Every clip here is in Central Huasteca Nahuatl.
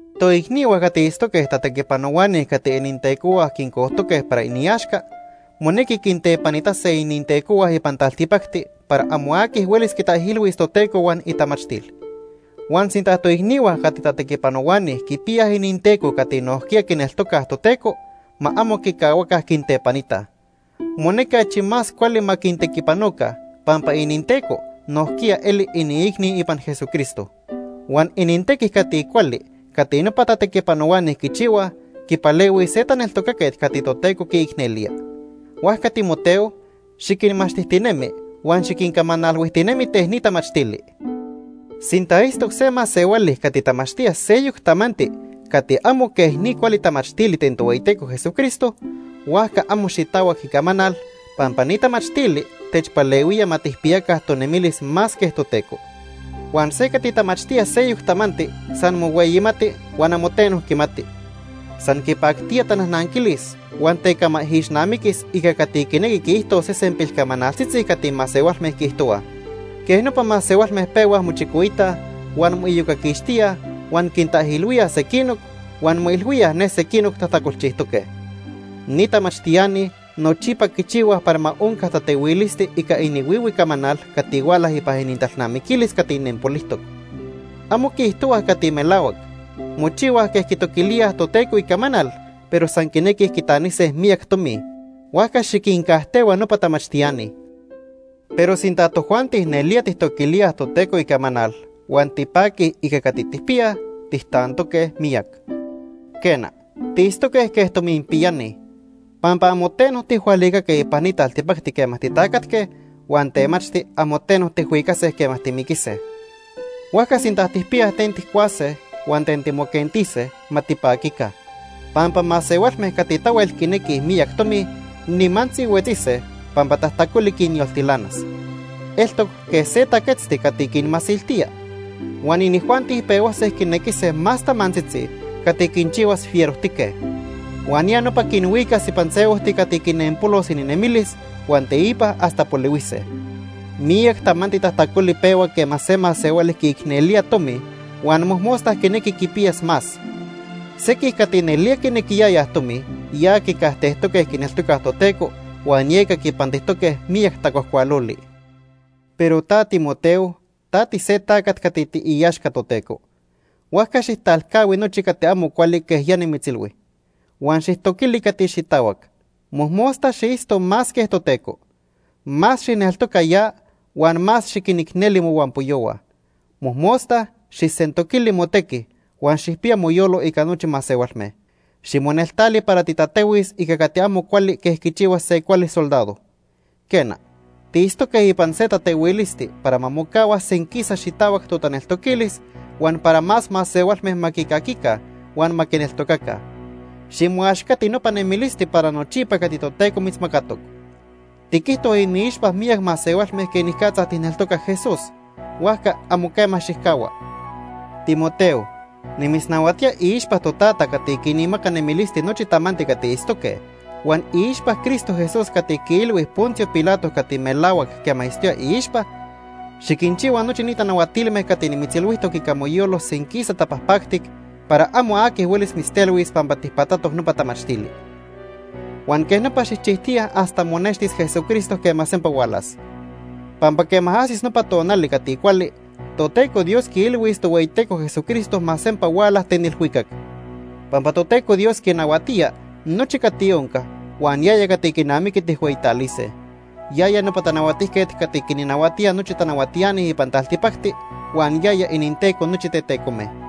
Toicnihua cati itztoque tatequipanohuani cati inintecohua quincojtoque para iniaxca monequi quintepanitase inintecohua ipan taltipacti para amo aqui huelis quitaijilhuis Toteco huan itamachtil. Huan sinta toicnihua cati tatequipanohuani quipiyaj ininteco cati nojquiya quineltocaj Toteco, ma amo quicahuaca quintepanitaj. Monequi achi más cuali ma quintequipanoca pampa ininteco nojquiya eli iniicni ipan Jesucristo. Huan inintequi cati cuali cati nopa tatequipanohuani quichihuaj quipalehuis se taneltocaquet cati Toteco quiicnelía. Huajca Timoteo, xiquinmachtijtinemi huan xiquincamanalhuijtinemi ten ni tamachtili. Sinta itztoc se masehuali cati tamachtía seyoc tamanti cati amo quej ni cuali tamachtili ten Tohueyiteco Jesucristo, huajca amo xitahuac icamanal, pampa ni tamachtili techpalehuía ma tijpiyaca tonemilis más quej Toteco. Huan se cati tamachtía seyoc tamanti san mohueyimati huan amo teno quimati. San quipactía tanajnanquilis huan tecamaijixnamiquis ica cati quinequi quiijtos sesen pilcamanaltzitzi cati masehualme quiijtohuaj. Quej nopa masehualme pehuaj mochicoitaj, huan moiyocaquixtíaj, huan quintaijilhuíaj sequinoc, huan moilhuíaj ne sequinoc tajtacolchijtoque. Ni tamachtiani nochipa quichihuaj para ma onca tatehuilisti ica inihuihui camanal cati huala ipan inintalnamiquilis cati nempolijtoc. Amo quiijtohuaj cati melahuac. Mochihuaj quej quitoquilíaj Toteco icamanal, pero san quinequij quitanise miyac tomi. Huajca xiquincajtehua nopa tamachtiani. Pero sinta tojuanti nelía tijtoquilíaj Toteco icamanal huan tipaquij ica cati tijpiyaj, tijtantoque miyac. Quena, tiitztoque quej tominpiyani. Pampa amo teno tijhualicaque ipan ni taltipacti quema titacatque huan temachti amo teno tijhuicase quema timiquise. Huajca sinta tijpiyaj ten tijcuase huan ten timoquentise, ma tipaquica, pampa masehualme cati tahuel quinequij miyac tomi, nimantzi huetzise, pampa tajtacoli quinyoltilanas. Eltoc quej se taquetzti cati quinmasiltía. Huan inijuanti pehuase quinequise más tamantzitzi cati quinchihuas cati fiero para inijuanti. Huan ya nopa quinhuicas ipan se ojti cati quinempolos ininemilis huan teipa hasta polihuise. Miyac tamanti tajtacoli pehua quema se masehuali quiicnelía tomi huan mojmosta quinequi quipiyas más. Sequij cati nelía quinequiyayaj tomi ya quicajtejtoque quineltocaj Toteco huan yeca quipantijtoque miyac tacuajcualoli. Pero ta Timoteo, ta tise tacat cati tiiaxca Toteco. Huajca xijtalcahui nochi cati amo cuali quej ya nimitzilhui. Huan xijtoquili cati xitahuac. Mojmosta xiitzto más quej Toteco. Más xijneltoca ya huan más xiquinicneli mohuampoyohua. Mojmosta xijsentoquili motequi huan xijpiya moyolo ica nochi masehualme. Ximoneltali para titatehuis ica cati amo cuali quej quichihua se cuali soldado. Quena, tiitztoque ipan se tatehuilisti para ma mocahua senquisa xitahuac totaneltoquilis huan para más masehualme ma quicaquica huan ma quineltocaca. Ximoaxcati nopa nemilisti para nochipa cati Toteco mitzmacatoc. Tiquijto iniixpa miyac masehualme quenicatza tijneltoca Jesús; huajca amo quema xijcahua. Timoteo, nimitznahuatía iixpa Totata cati quinmaca nemilisti nochi tamanti cati itztoque huan iixpa Cristo Jesús cati quiilhui Poncio Pilato cati melahuac quema itztoya iixpa, xiquinchihua nochi ni tanahuatilme cati nimitzilhuijtoc ica moyolo senquisa tapajpactic para amo aqui huelis mitztelhuis pampa tijpatatoc nopa tamachtili. Huan quej nopa xijchijtiya hasta monextis Jesucristo quema sempa hualas. Pampa quema ajsis nopa tonali cati cuali, Toteco Dios quiilhuis Tohueyiteco Jesucristo ma sempa huala ten ilhuicac. Pampa Toteco Dios quinahuatía nochi cati onca huan yaya cati quinamiqui tijhueyitalise. Yaya nopa Tanahuatijquet cati quinnahuatía nochi tanahuatiani ipan taltipacti huan yaya ininTeco nochi tetecome.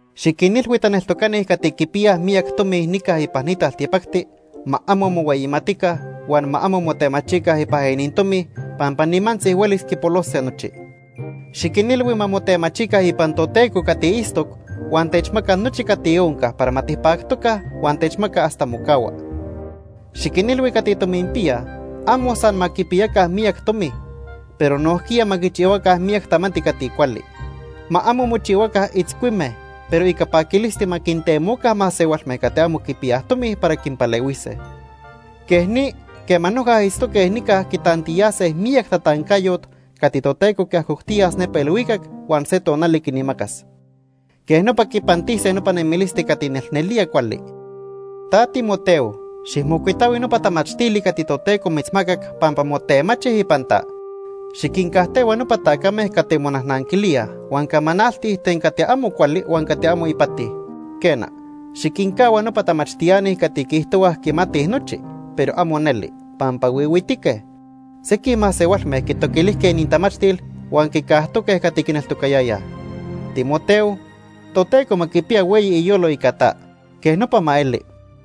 Xiquinilhui taneltocani cati quipiyaj miyac tomi nica ipan ni taltipacti, ma amo mohueyimatica huan ma amo motemachica ipan inintomi pampa nimantzi huelis quipolose nochi. Xiquinilhui ma motemachica ipan Toteco cati itztoc huan techmaca nochi cati onca para ma tipactoca huan techmaca hasta mocahua. Xiquinilhui cati tominpiyaj amo san ma quipiyaca miyac tomi, pero nojquiya ma quichihuaca miyac tamanti cati cuali. Ma amo mochihuaca itzcuime, pero ica paquilisti ma quintemoca masehualme cati amo quipiyaj tomi para quinpalehuise. Quej ni quema noja itztoque nica quitantiyase miyac tatancayot cati Toteco quiajoctiyas nepa ilhuicac huan se tonali quinmacas. Quej nopa quipantise nopa nemilisti cati nelnelía cuali. Ta Timoteo, xijmocuitahui nopa tamachtili cati Toteco mitzmacac pampa motemachi ipan ta. Xiquincajtehua nopa tacame cati monajnanquilíaj huan camanaltij ten cati amo cuali huan cati amo ipati. Quena, xiquincahua nopa tamachtiani cati quiijtohuaj quimatij nochi, pero amo neli, pampa huihuitique. Sequij masehualme quitoquilijque inintamachtil huan quicajtoque cati quineltocayayaj. Timoteo, Toteco ma quipiya hueyi iyolo ica ta. Quej nopa ma eli.